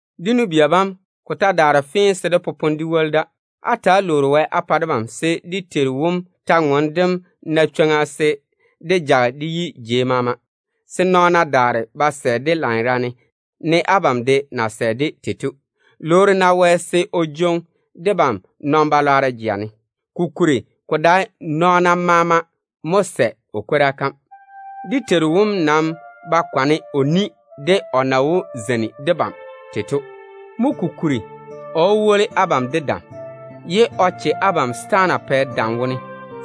Dé nu-bia bam, ko ta daare fee se dé popone dé woli da. Ta‑á lwoori-na Wɛ á pa debam, se dé Teiru wom kwor-ywoŋa kam jage ka yi jei maama, se nɔɔna daare ba sɛ-ka lanyerane, ne abam de na sɛ-ka tei to. Lwoori-na Wɛ se o jwoŋi debam nɔn-balwaaro jeŋa ne, kokuri ko dae nɔɔna bam maama mo sɛ Wɛ chega kam. Dé Teiru wom nam zege o chega wone de o na wó zeini debam tei to. Mo kokuri, o wó woli abam de dam, ye o che abam setaana pɛ dam wone.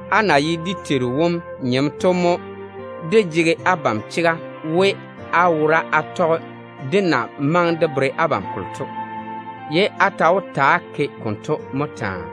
Á na ye dé Teiru wom nyem to mo dé jege abam chega we, á wora á tɔge dé na maŋe de bere abam kolo to, ye á ta wó ta‑á ke konto mo taa.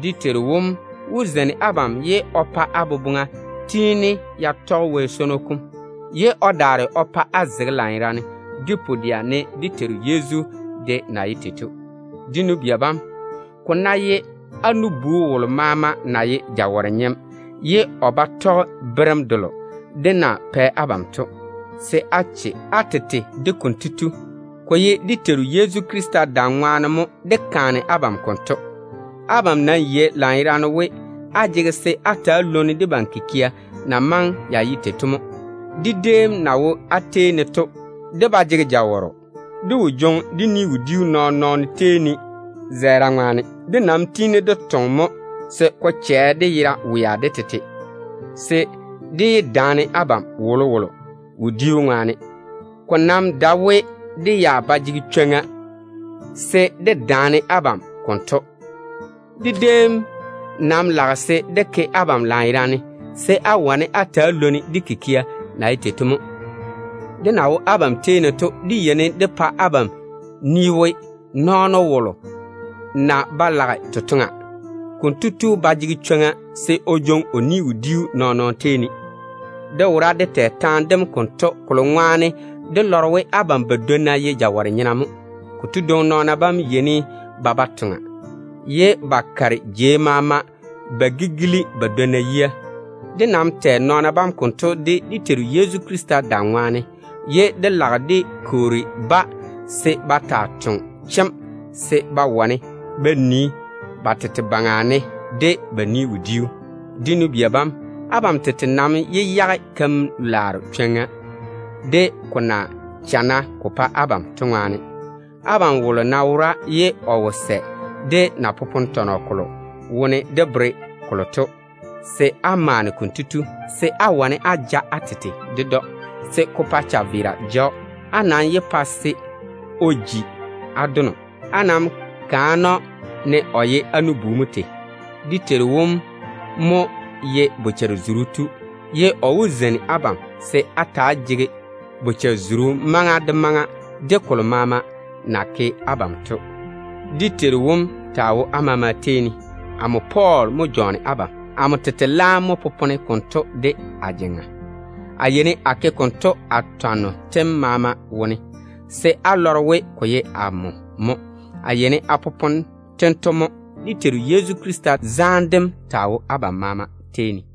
Dé Teiru wom wó zeini abam, ye o pa á boboŋa tiini ya tɔge Wɛ swono kom, ye o daare o pa á zege lanyerane de pu-dɛa, ne Yezu Krista de na ye tei to. Dé nu-bia bam, ko ná ye á nu-bu wolo maama na ye jawɔre-nyem ye o ba tɔge berem delo dé na pɛ abam to, se á lɔŋe konto tu. Ko ye dé Teiru Yezu Krista dam ŋwaane mo dé kaane abam konto. Abam nam yei lanyerane we, á jege se á ta‑á lwoni debam kikia na maŋe ya ye tei to mo. Dé déem na wo á tei ne to, dé ba jege jawɔrɔ. Dé wo jwoŋi dé ni-wodiu nɔɔn-nɔɔno tei ne zɛɛra ŋwaane. Dé nam tiini dé toŋe mo se ko chɛ dé yera wea de tete, se dé yé daane abam wolowolo wodiu ŋwaane. Ko nam dae we dé ya ba jege chwoŋa se dé daane abam konto. Dé déem nam lage se dé ke abam lanyerane se á wane á ta‑á lwoni dé kikia na ye tei to mo. Dé na wo abam tei ne to, dé yeini dé pa abam ni we, nɔɔno wolo ná ba lage totoŋa, konto tu ba jege chwoŋa se o jwoŋi o ni-wodiu nɔɔn-nɔɔno tei ne. Dé wora dé tɛ taane dem konto, kolo ŋwaane dé lɔre we abam badwonna ye jawɔre-nyena mo. Konto dwoŋi nɔɔna bam yeini ba ba toŋa, ye ba kare jei maama ba gigili ba dwonna yia. Dé nam tiini dé kwoori nɔɔna bam konto dé Teiru Yezu Krista dam ŋwaane, se ba taa toŋe chemm se ba wane ba nii ba tete baŋa ne de ba ni-wodiu. Dé nu-bia bam, abam tete nam yé yage totoŋ-laaro keim, ko ná maŋe ko chana ko pa abam tei to de. Abam wolo ná wora ye o wo sɛ debam na popone tɔnɔ konto wone dé bere kolo to, se á maane konto tu, se á wane á ja á tete ded‑o, se ko pa chaveera ja‑o. Á nam yé pa se o ji á dono. Ko nam maŋe se á kaane‑o, ne o ye á nu-bu mo tei. Dé Teiru wom mo ye bochare-zuru tu. O maa wó zeini abam se á ta‑á jege bochare-zuru maŋa maama wone, de kolo maama na ke abam to. Dé Teiru wom taa wo á maama tei ne. Amo Pɔɔl mo jɔɔne abam. Amo tete laam mo popone konto de a jeŋa. A yeini a ke konto a twanno tem maama wone, se á lɔre we ko seene ko ye amo mo. A yeini a popone tento dwoŋi mo. Dé Teiru Yezu Krista zaane dem taa wo abam maama tei ne.